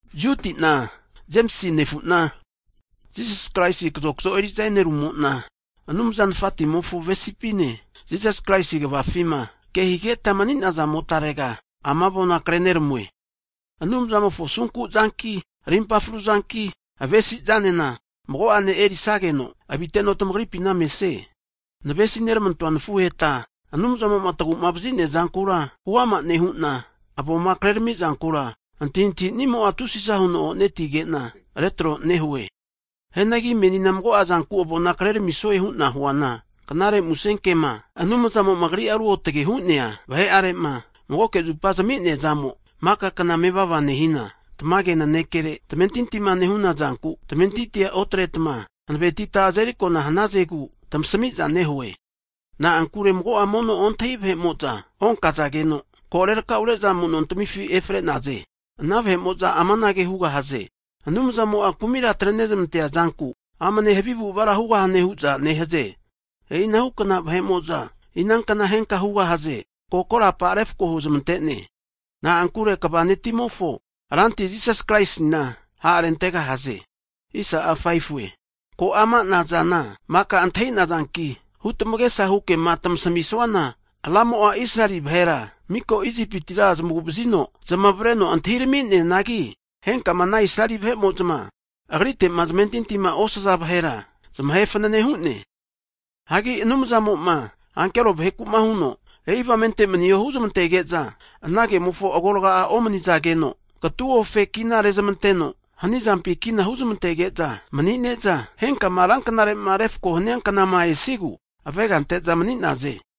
Juti'na, Jemisi nefu'na Jisas Kraisi kazokzo eri'za e'nerumo'na, Anumza Nafatimofo avesipine, Jisas Kraisi kavafima kehigeta mani'nazamotarega, ama avona kre'neramue. Anumzamofo asunkuzanki, arimpa fru'zanki, avesi'zanena mago'ane erisageno, aviteno tamagripina mesie. Navesi neramantoa nafuheta, Anumzamo'ma tagu'mavazinia zankura huama nehu'na avoma kreramizankura antahintahinimo'a tusiza huno onetige'na retro nehue. Hianagi menina mago'a zanku avona kreramisue hu'na huana, Knare Musenkema, Anumzamo'ma Agri'a ruotge hu'nea vahe'arema magoke zupa zami'neazamo maka kna mevava nehina, tamage nanekere tamentintima nehunazanku, tamentinti otretma hanavetita azeri akona hanazegu tamasmiza nehue. Na'ankure mago'a mono ontahi vahe'mo'za onkazageno, ko rerakaure'za amuno tamifi efre'naze. Ana vahe'mo'za amanage hugahaze, Anumzamo'a kumira atre'nezamantea zanku amane havi avu'avara hugahune hu'za nehaze. E'inahukna vahe'mo'za inankna henka hugahaze, korapa refako huzamantene. Na'ankure Kva netimofo Ranti Jisas Kraisina ha'rentegahaze. Ko amana zana maka antahinazanki, huramagesahu kema tamasamisuana, Ramo'a Israeli vahera miko Isipitira zamagu'vazino zamavareno atirami'neanagi, henka ana Israeli vahe'mo'za, Agrite'ma zamentintima osazageno'a zamahe fanane hu'ne. Hagi Anumzamoma ankero vaheku'ma huno, e'i avamente maniho huzmantege'za ana kemofo agorga'a omanizageno, katuofe kina rezamanteno hanizampi kina huzamantege'za mani'neza, henkama ranknarema refakoma hania knama esigu avega ante'za mani'naze.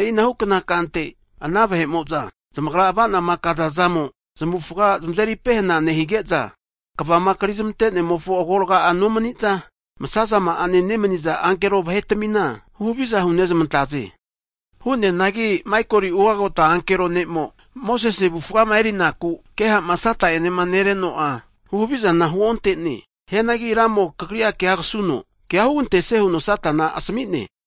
E'i anhukna kante, ana vahe'mo'za zamagra avanama kazazamo zamavufaga zamazeri pehenage nehige'za, kavama krizmante'nemofo agorga'a nomaniza, masazama'ane nemaniza ankero vahetamina huhaviza hunezmantaze. Hu'neanagi Maikoli ugota ankero ne'mo, Mosese avufama erinaku keha'ma Sata'enema nereno'a, huhavizana huonte'ne. Hianagi Ramo'a kagrira kea kasuno kea hugantesie huno Satana asami'ne.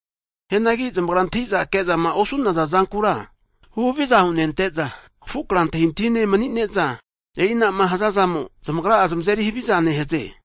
Hianagi zamagra antahi'za ke'zama osu'naza zankura huhaviza hunente'za, afu kra antahintahine mani'ne'za, e'inama hazazamo zamagra'a zamazeri haviza nehaze.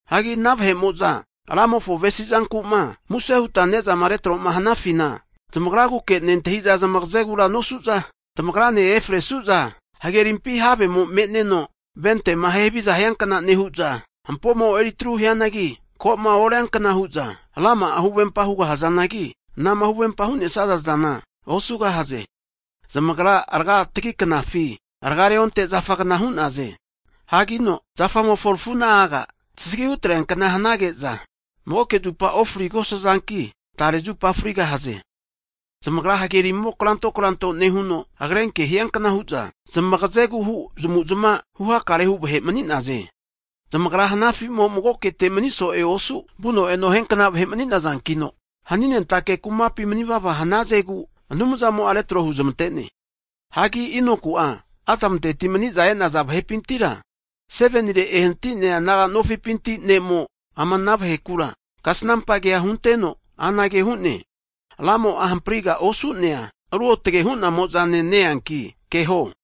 Hagi ana vahe'mo'za Ramofo avesizanku'ma muse huta ne'zama retro'ma hanafina zamagraguke nentahi'za zamagazegura nosu'za tamagripima efresu'za, hagerimpi havemo me'neno ventema ahe haviza hiankna nehu'za, hampomo eri atru huteno ko'ma orienkna hu'za rama'a huvempa hugahazanagi, anama huvempa hu'nesazazana osugahaze. Zamagra raga'a tagi knafi raga reonte zafagna hu'naze. Hanki zafamofo rafu'na'aga tasagi hutreankna hanige'za magoke zupage ofrigosazanki, tare zupa frigahaze. Zamagra hagerimo kranto kranto nehuno, agrenke hiankna hu'za, zmagazehu zamavu'zmava huhakarehu vahe mani'naze. Zamagra hanafimo magokete mani so'e osu vuno eno hiankna vahe mani'nazankino, haninentake kumapi manivava hanazegu Anumzamo'a retro huzmante'ne. Hagi Inoku'a, Adamunteti maniza e'naza vahepintira 7nire ehanati'nea naga nofipinti ne'mo ama ana vahekura kasanampa kea hunteno anage hu'ne, Ramo'a hampriga osu'nea ruotge hu'namo'zane ne-eanki keho.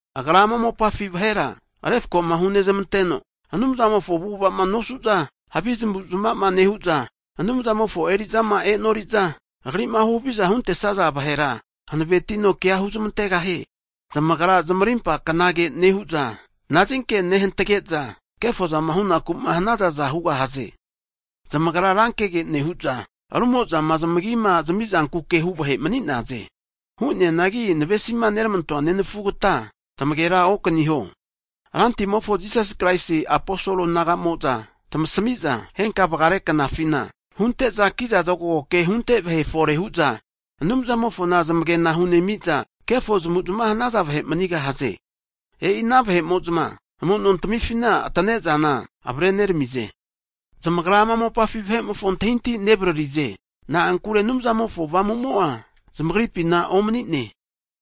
Agra ama mopafi vahera refkoma hunezmanteno, Anumzamofo avu'ava'ma nosu'za havi zamavu'zmava nehu'za, Anumzamofo eri'zama e'noriza, Agri'ma huhavizama huntesaza vahera, hanavetino kea huzmantegahie. Zamagra zamarimpa knage nehu'za, nazinke nehantage'za, kefozama hunaku'ma hanazaza hugahaze. Zamagra rankege nehu'za ru'mozama zamigima zamizankuke hu vahe manigahaze. Hu'neanagi navesima neramantoa nenafugata tamagera okaniho, Rantimofo Jisasi Kraisi aposol naga'mo'za tamasimiza, henka vagare knafina hunte'za kiza zokago ke hunte vahe fore nehu'za Anumzamofoma zamage'na hunemi'za, kefo zamavuzamava hanaza vahe manigahaze. E'ina vahe'mo'za amu'no tamifina atane'zana avare'neramize. Zamagra ama mopafi vahe'mofo antahintahi nevaririze. Na'ankure Anumzamofo Avamumo'a' zamagripina omanine.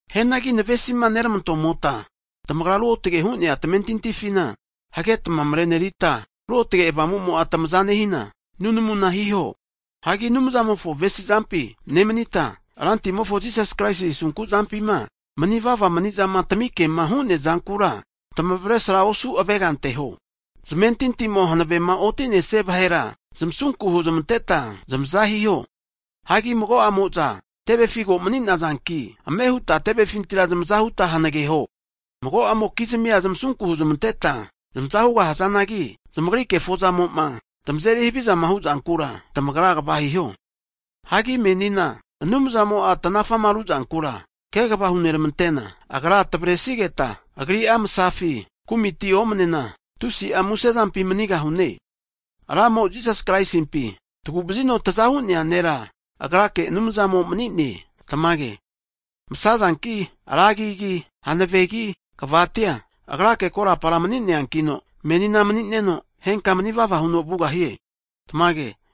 Hianagi navesima neramantomota tamagra ruotge hu'nea tamentintifina hagetma mrenerita, Ruotge Avamumo'a tamaza nehina nunamuna hiho. Hagi Anumzamofo avesizampi nemanita, Rantimo Jisas Kraisi asunku zampima manivava manizama tamikema hu'nea zankura tamavresra osu avega anteho. Zamentintimo hanavema otinesia vahera, zmasunku huzmanteta zamaza hiho. Hagi mago'amo'za tevefi ko mani'nazanki, ame huta tevefintira zamaza huta hanageho. Mago'amokizmia tamasunku huzmanteta zamaza hugahazanagi, zamagri kefo'zamoma tamazeri havizama huzankura, tamagra kva hiho. Hagi menina Anumzamo'a tanafama hu'zankura kegava huneramanteno, Agra tavaresigeta Agri'a masafi kumitami omanena, tusi'a musezampi manigahaze. Ramo, Jisas Kraisimpi tagu'vazino taza hu'nea Nera, Agrake Anumzamo mani'ne, Tamage. Masazanki, ra agigi, hanavegi, kavatia Agrake korapara mani'neankino menina mani'neno, henka manivava huno vugahie. Tamage.